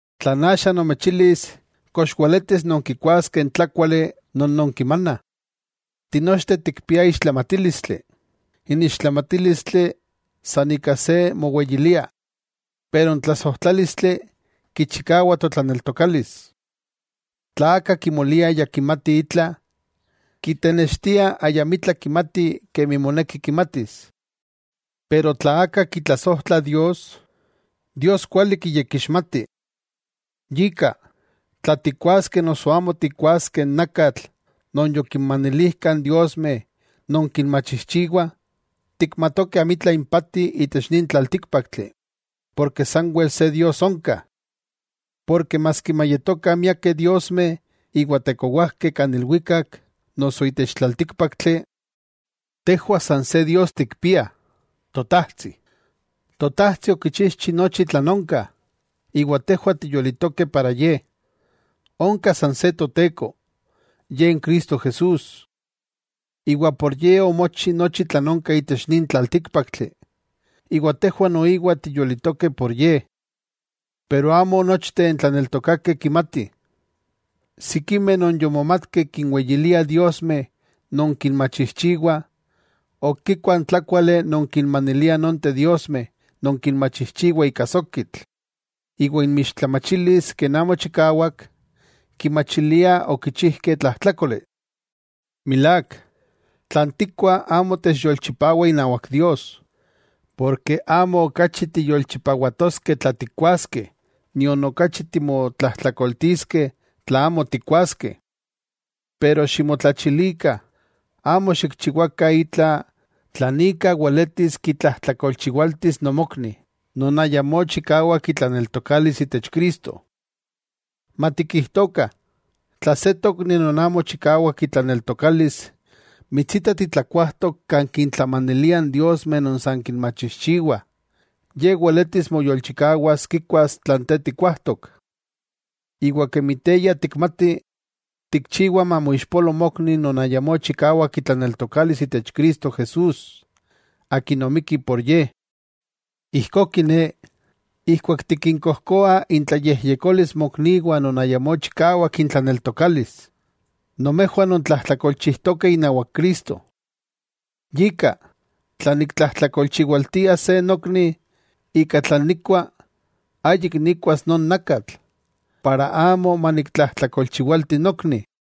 Tlan axa nomechilis kox weletis nonkikuaskeh n tlákuali non nonkimanah. Tinochteh tikpiah ixtlamatílistli, n ixtlamatílistli san ika se moweyiliah. Pero n tlasojtlálistli kichikawa totlaneltokalis. Tla aka kimolia ya kimati itla, kitenextia ayamitla kimati kemi moneki kimatis. Pero tla aka kitlasojtla Dios, Dios kuali kiyekixmati. Yika, tla tikkuaskeh noso amo tikkuaskeh n nakatl non yokinmanilijkah n diosmeh non kinmachijchiwah, tikmatokeh amitla impati itech nin tlaltíkpaktli, porke sanwel se Dios onka. Porke maski mayetokah miakeh diosmeh iwa tekowajkeh kan ilwikak noso itech tlaltíkpaktli, tejwah san se Dios tikpiah, Totajtsi. Totajtsi okichijchi nochi tlan onka, iwa tejwah tiyolitokeh para Ye. Onka san se Toteko, Ye n Cristo Jesús. Iwa por Ye omochi nochi tlan onka itech nin tlaltíkpaktli, iwa tejwah noiwa tiyolitokeh por Ye. Pero amo nochteh n tlaneltokakeh kimatih. Sikimeh non yomomatkeh kinweyiliah diosmeh non kinmachijchiwah, ok kikuah n tlákuali non kinmaniliah nonteh diosmeh non kinmachijchiwah ika sokitl, iwa inmixtlamachilis ken amo chikawak, kimachiliah okichijkeh tlajtlákoli. Milák, tlan tikuah amo techyolchipawa inawak Dios. Porke amo okachi tiyolchipawatoskeh tla tikkuaskeh, nion okachi timotlajtlakoltiskeh tla amo tikkuaskeh. Pero ximotlachilikah amo xikchiwakah itla tlan ika weletis kitlajtlakolchiwaltis nomokni, non ayamó chikawak itlaneltokalis itech Cristo. Matikijtokah, tla se tokni non amo chikawak itlaneltokalis mitsita titlakuajtok kan kintlamaniliah n diosmeh non san kinmachijchiwah, ye weletis moyolchikawas kikuas tlan te tikkuajtok. Iwa kemi te ya tikmati, tikchiwa mamoixpolo mokni non ayamó chikawak itlaneltokalis itech Cristo Jesús, Akin omikki por ye. Ijkó kiné, ijkuak tikinkojkoa intlayejyekolis mokniwah non ayamó chikawak intlaneltokalis, nomejwah nontlajtlakolchijtokeh inawak Cristo. Yika, tla niktlajtlakolchiwaltia se nokni ika tlan nikkua, ayik nikkuas non nakatl, para amo maniktlajtlakolchiwalti nokni.